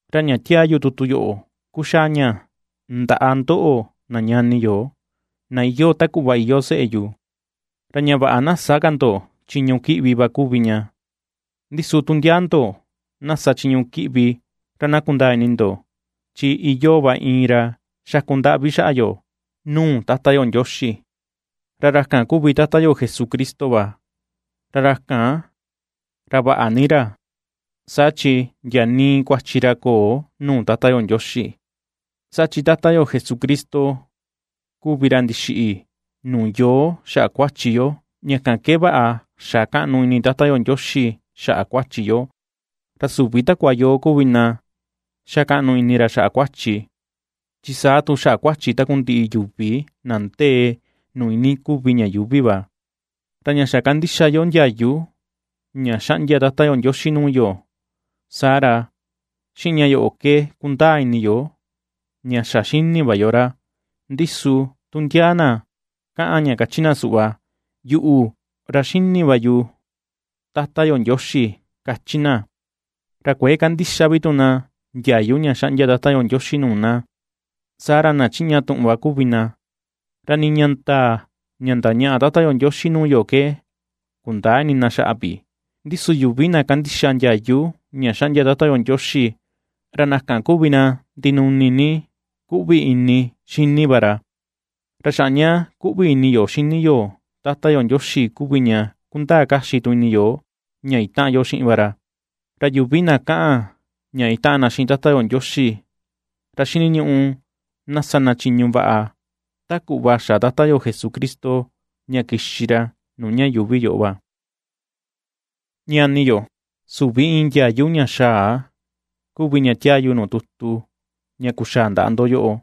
Ra ña tiaa yu tutu yoꞌo kuxaa ña ndaꞌa ndoꞌo, na ñani yo, na iyoo ta kuꞌva iyoo seꞌe yu, ra ña vaꞌa na sä ka ndo chiñu kiꞌvi va kuvi ña. Ndi su tu ndiaa ndo na sa chiñu kiꞌvi, ra na kundaa ini ndo, chi iyoo va iin ra xaku ndaꞌvi xaꞌa yo nuu Tata yo Ndioxi, ra ra kan kuvi Tata yo Jesucristo va, ra ra kan, ra vaꞌa ni ra, saa chi ndia nii kuachi ra köo nuu Tata yo Ndioxi. Saa chi Tata yo Jesucristo kuvi ra ndixiꞌi nuu yoo xaꞌa kuachi yo ña kan ke vaꞌa xa kaꞌnu ini Tata yo Ndioxi xaꞌa yo, ra süvi takua yoo kuvi na ndixa kaꞌnu ini ra xaꞌa kuachi, chi saa tu xaꞌa kuachi takundiꞌi yuvi na ndee nuu iinii kuvi ña yuuvi va. Ra ña xa kandixa yo ndiayu ña xaꞌndia Tata yo Ndioxi nuu yo, saa ra xiꞌin ña yoꞌo ke kundaa ini yo, ña xa xini va yo ra. Ndi su tu ndia na ^kaꞌan ña kachi na suꞌva: “Yuꞌu, ra xíní va yu Tata yo Ndioxi”, kachi na, ra kuëe kandixa vi tu na ndiayu ña xaꞌndia Tata yo Ndioxi nuu na, saa ra na chiꞌña tuꞌun va kuvi na, ra nii ña ndaa ña ndañaꞌa Tata yo Ndioxi nuu yo ke kundäa ini na xaꞌa vi. Ndi su yuvi na kandixa ndiayu ña xaꞌndia Tata Ndioxi, ra na kan kuvi na ndinuni ni kuꞌvi ini xini va ra; ra xaꞌa ña kuꞌvi ini yo xini yo Tata yo Ndioxi kuvi ña kundaa kaxi tu ini yo ña itaꞌan yo xiꞌin va ra. Ra yuvi na kaꞌan ña itaꞌan na xiꞌin Tata yo Ndioxi, ra xiniñuꞌu na sa na chiñu vaꞌa ta kuꞌva xa Tata yo Jesucristo ña kixi ra nuu ña yuuvi yoꞌo va. Ñani yo, süvi iin ndiayu ña xaa kuvi ña tiaa yu nuu tutu ña kuxaa ndaꞌa ndo yoꞌo;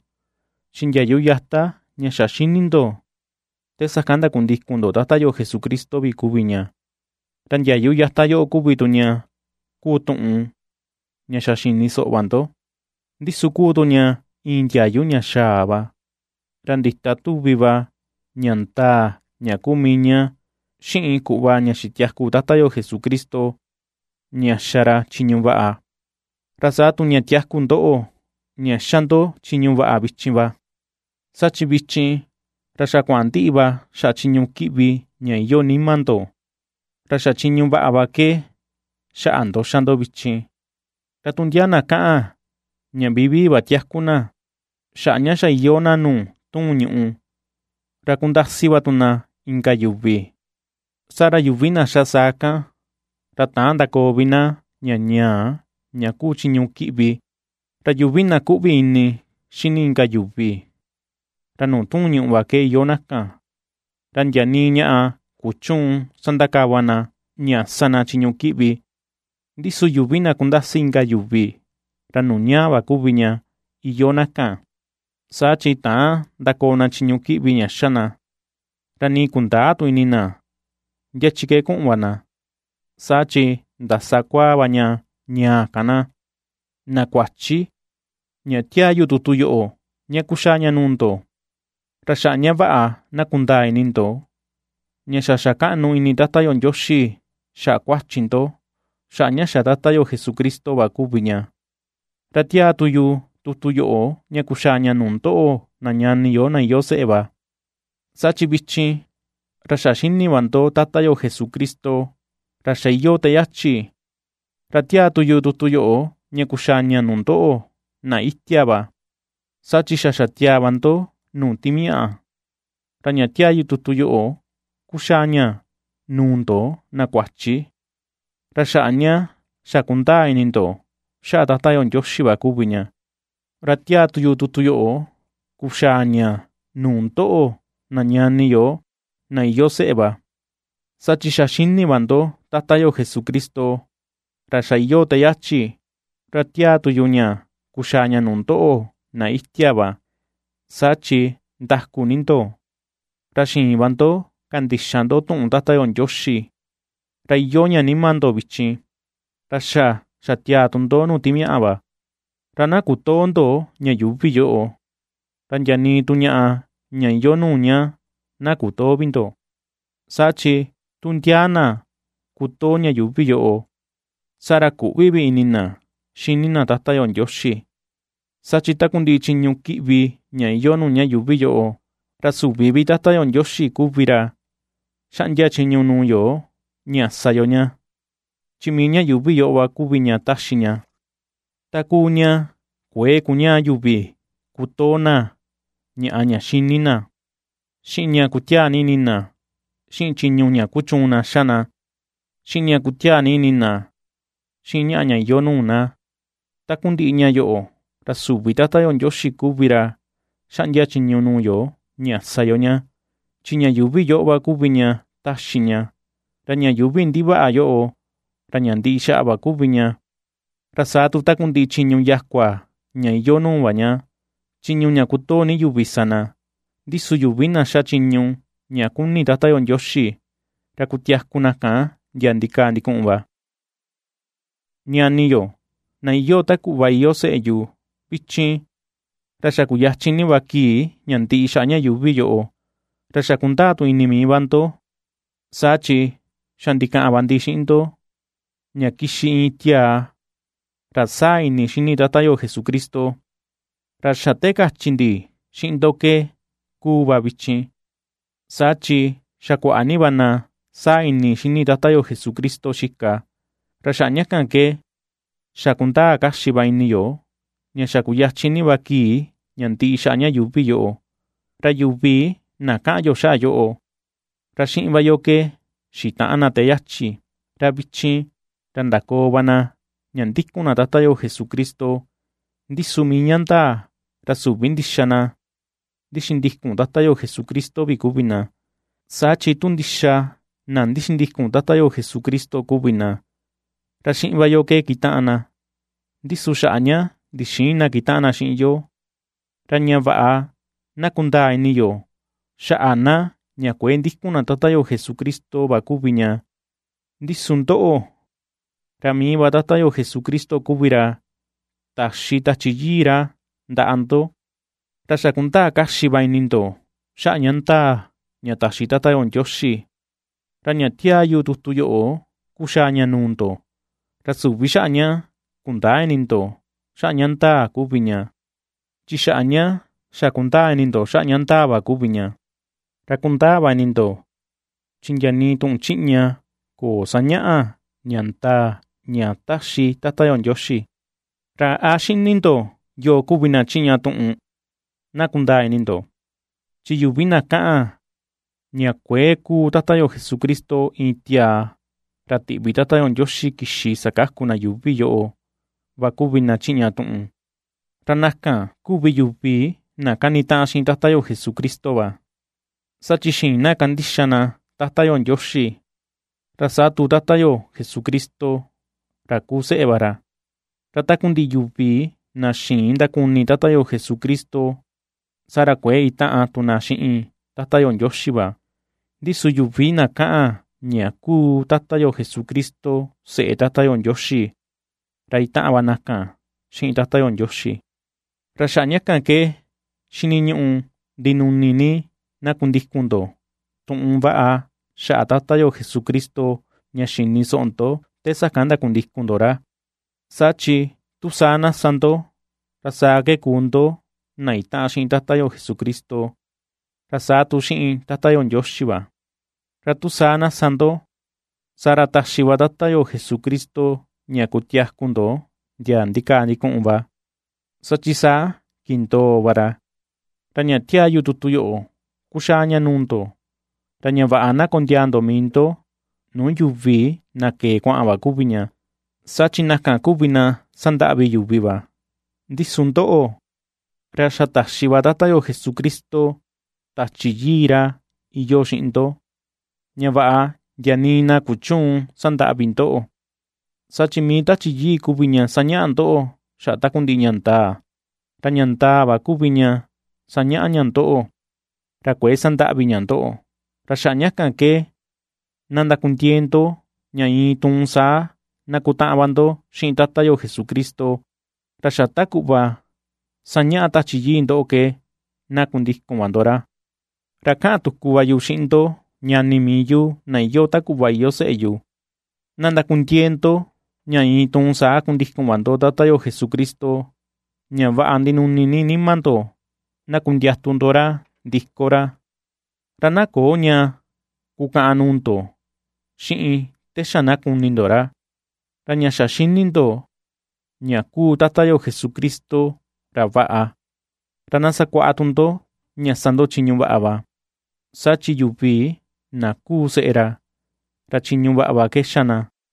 chi ndiayu yata ña xa ^xini ndo te sakan ndakundikun ndo Tata yo Jesucristo vi kuvi ña. Ra ndiayu yata yoꞌo kuvi tu ña kuu tuꞌun ña xa xini soꞌo va ndo. Ndi su kuu tu ña iin ndiayu ña xaa va, ra ndita tuvi va ña ndaa ña kuu mii ña xiꞌin kuꞌva ña xitiaku Tata yo Jesucristo, ña xa ra chiñu vaꞌa, ra saa tu ña tiaku ndoꞌo, ña xa ndo chiñu vaꞌa vichin va; saa chi vichin, ra xa kuaꞌan ndiꞌi va xaꞌa chiñu kiꞌvi ña iyoo nima ndo, ra xa chiñu vaꞌa va ke xaꞌa ndo xa ndo vichin. Ra tu ndia na kaꞌan ña vivii va tiaku na xaꞌa ña xa iyoo na nuu tuun ñùꞌù, ra kundasi va tu na inka yuvi, saa ra yuvi na xa saa kan, ra täan ndakoo vi na ña ñaa, ña kuu chiñu kiꞌvi. Ra yuvi na ^kuꞌvi ini xíní inka yuvi, ra nuu tuun ñùꞌù va ke iyoo na kan, ra ndia nii ñaꞌa kuchüun sandakava na ña sa na chiñu kiꞌvi. Ndi su yuvi na kundasi inka yuvi, ra nuu ñaa va kuvi ña iyoo na kan, saa chi täan ndakoo na chiñu kiꞌvi ña xa na, ra nii kundäa tu ini na ndia chi ke kuꞌun va na, saa chi ndasa kuaa va ña ñaa kan na. Na kuachi, ña tiaa yu tutu yoꞌo ña kuxaa ña nuu ndo, ra xaꞌa ña vaꞌa na kundaa ini ndo, ña xa xa kaꞌnu ini Tata yo Ndioxi, xaꞌa kuachi ndo, xaꞌa ña xa Tata yo Jesucristo va kuvi ña. Ra tiaa tu yu tutu yoꞌo, ña kuxaa ña nuu ndoꞌo, na ñani yo, na iyoo seꞌe va, saa chi vichin, ra xa xini va ndo Tata yo Jesucristo, ra xa iyoo te yachi. Ra tiaa tu yu tutu yoꞌo, ña kuxaa ña nuu ndoꞌo, na itia va, saa chi xa xatiaa va ndo nuu timiaꞌa. Ra ña tiaa yu tutu yoꞌo kuxaa ña nuu ndo na kuachi, ra xaꞌa ña xa kundaa ini ndo xaꞌa Tata yo Ndioxi va kuvi ña. Ra tiaa yu tutu yoꞌo kuxaa ña nuu ndoꞌo, na ñani, na iyoo seꞌe va, saa chi xa xini va ndo Tata yo Jesucristo, ra xa iyoo te yachi. Ra tiaa tu yu ña kuxaa ña nuu ndoꞌo, na itia va, saa chi ndaku ni ndo, ra xiin va ndo kandixa ndo tuꞌun Tata yo Ndioxi, ra iyoo ña nima ndo vichin, ra xa xatiaa tu ndo nuu timiaꞌa va. Ra na kutöo ndo ña yuuvi yoꞌo, ra ndia nii tu ñaꞌa ña iyoo nuu ña na kutöo vi ndo. Saa chi tu ndia na kutoo ña yuuvi yoꞌo, saa ra küꞌvi vi ini na xini na Tata yo Ndioxi; Saa chi takundiꞌi chiñu kiꞌvi ña iyoo nuu ña yuuvi yoꞌo, ra süvi Tata yo Ndioxi kuvi ra xaꞌndia chiñu nuu yo ña sa yo ña, chi mii ña yuuvi yoꞌo va kuvi ña taxi ña. Ta kuu ña kuëe kuñaa yuvi kutoo na ñaꞌa ña xini na, xiꞌin ña kutiaa ni ini na xiꞌin chiñu ña kuchuun na xa na, xiꞌin ña kutiaa ni ini na xiꞌin ñaꞌa ña iyoo nuu na. Takundiꞌi ña yoꞌo ra süvi Tata yo Ndioxi kuvi ra xaꞌndia chiñu nuu yo ña sa yo ña, chi ña yuuvi yoꞌo va kuvi ña taxi ña. Ra ña yuuvi ndivaꞌa yoꞌo, ra ña ndiꞌi xa va kuvi ña, ra saa tu takundiꞌi chiñu yakua ña iyoo nuu va ña, chiñu ña kutoo ni yuvi sa na. Ndi su yuvi na xa chiñu ña kuni Tata yo Ndioxi, ra kutiaku na kan ndia ndikaa ndikuꞌun va. Ñani yo, na iyoo ta kuꞌva iyoo seꞌe yu, vichin, ra xa kuyachin ni va kii ña ndiꞌi xaꞌa ña yuuvi yoꞌo. Ra xa̱ ^kundaa tu ini mii va ndo, saa chi xa ndikaꞌan va ndi xiꞌin ndo, ña kixi iin tiaa ra saa ini xini Tata yo Jesucristo. Ra xa te kachi ndi xiꞌin ndo ke ^kuu va vichin, saa chi xa kuaꞌa ni va na saa ini xini Tata yo Jesucristo xika, ra xaꞌa ña kan ke xa kundaa kaxi va ini yo ña xa kuyachin ni va kii ña ndiꞌi xaꞌa ña yuuvi yoꞌo. Ra yuvi na kaꞌan yo xaꞌa yoꞌo, ra xiꞌin va yo ke xitaꞌan na te yachi, ra vichin, ra ndakoo va na ña ndikun na Tata yo Jesucristo, ndi su mii ña ndaa, ra süvi ndixa na ndixindikun Tata yo Jesucristo vi kuvi na, saa chi tu ndixa na ndixindikun Tata yo Jesucristo kuvi na, ra xiꞌin va yo ke kitaꞌan na. Ndi su xaꞌa ña ndixïin na kitaꞌan na xiꞌin yo, ra ña vaꞌa na kundaa ini yo xaꞌa na ña kuëe ndikun na Tata yo Jesucristo va kuvi ña. Ndi su ndoꞌo, ra mii va Tata yo Jesucristo kuvi ra taxi Tachi Yii ra ndaꞌa ndo, ra xa kundaa kaxi va ini ndo xaꞌa ña ndaa ña taxi Tata yo Ndioxi. Ra ña tiaa yu tutu yoꞌo kuxaa ña nuu ndo, ra süvi xaꞌa ña kundäa ini ndo xaꞌa ña ndaa kuvi ña, chi xaꞌa ña xa kundaa ini ndo xaꞌa ña ndaa va kuvi ña, ra kundaa va ini ndo, chi ndia nii tuꞌun chiꞌña köo sañaꞌa ña ndaa ña taxi Tata yo Ndioxi. ¿Ra a xini ndo yoo kuvi na chiꞌña tuꞌun? Na kundaa ini ndo, chi yuvi na kaꞌan ña kuëe kuu Tata yo Jesucristo, iin tiaa ra tiꞌvi Tata yo Ndioxi kixi sakaku na yuuvi yoꞌo va kuvi na chiꞌña tuꞌun. Ra na kan kuvi yuvi na kanitaꞌan xiꞌin Tata yo Jesucristo, saa chi xïin na kandixa na Tata yo Ndioxi, ra saa tu Tata yo Jesucristo, ra kuu seꞌe va ra. Ra takundiꞌi yuvi na xïin ndakuni Tata yo Jesucristo, saa ra kuëe itaꞌan tu na xiꞌin Tata yo Ndioxi va, ndi su yuvi na kaꞌan ña kuu Tata yo Jesucristo, seꞌe Tata yo Ndioxi, ra itaꞌan va na kan xiꞌin Tata yo Ndioxi. Ra xaꞌa ña kan ke xiniñuꞌu ndinuni ni, na kundikun ndo tuꞌun vaꞌa xaꞌa Tata yo Jesucristo, ña xini soꞌo ndo te sakan ndakundikun ndo ra; saa chi tu saa na sa ndo, ra saa ke kuu ndo na itaꞌan xiꞌin Tata yo Jesucristo, ra saa tu xiꞌin Tata yo Ndioxi va. Ra tu saa na sa ndo, saa ra taxi va Tata yo Jesucristo ña kutiaku ndo ndia ndikaa ndikuꞌun va, saa chi saa kindoo va ra. Ra ña tiaa yu tutu yoꞌo kuxaa ña nuu ndo, ra ña vaꞌa na kondiaa ndo mii ndo nuu yuvi na kee kuaꞌan va kuvi ña, saa chi na kan kuvi na sandaꞌvi yuvi va. Ndi su ndoꞌo, ra xa taxi va Tata yo Jesucristo Tachi Yii ra iyoo xiꞌin ndo, ña vaꞌa ndia nii na na kuchüun sandaꞌvi ndoꞌo, saa chi mii va Tachi Yii kuvi ña sañaꞌa ndoꞌo xaꞌa takundiꞌi ña ndaa, ra ña ndaa va kuvi ña sañaꞌa ña ndoꞌo, ra kuëe sandaꞌvi ña ndoꞌo. Ra xaꞌa ña kan ke na ndakundiee ndo ña iin tuun saa na kutaꞌan va ndo xiꞌin Tata yo Jesucristo, ra xa ta kuꞌva ^sañaꞌa Tachi Yii ndoꞌo ke na kundikun va ndo ra. Ra kaꞌan tuku va yu xiꞌin ndo ñani mii yu, na iyoo ta kuꞌva iyoo seꞌe yu, na ndakundiee ndo ña iin tuun saa kundikun va ndo Tata yo Jesucristo, ña vaꞌa ndinuni ni nima ndo na kundiatu ndo ra ndiko ra, ra na köo ña kukäꞌan nuu ndo xiꞌin te xa na kuni ndo ra. Ra ña xa xini ndo, ña kuu Tata yo Jesucristo ra vaꞌa, ra na sakuaꞌa tu ndo ña sa ndo chiñu vaꞌa va, saa chi yuvi na kuu seꞌe ra, ra chiñu vaꞌa va ke xa na.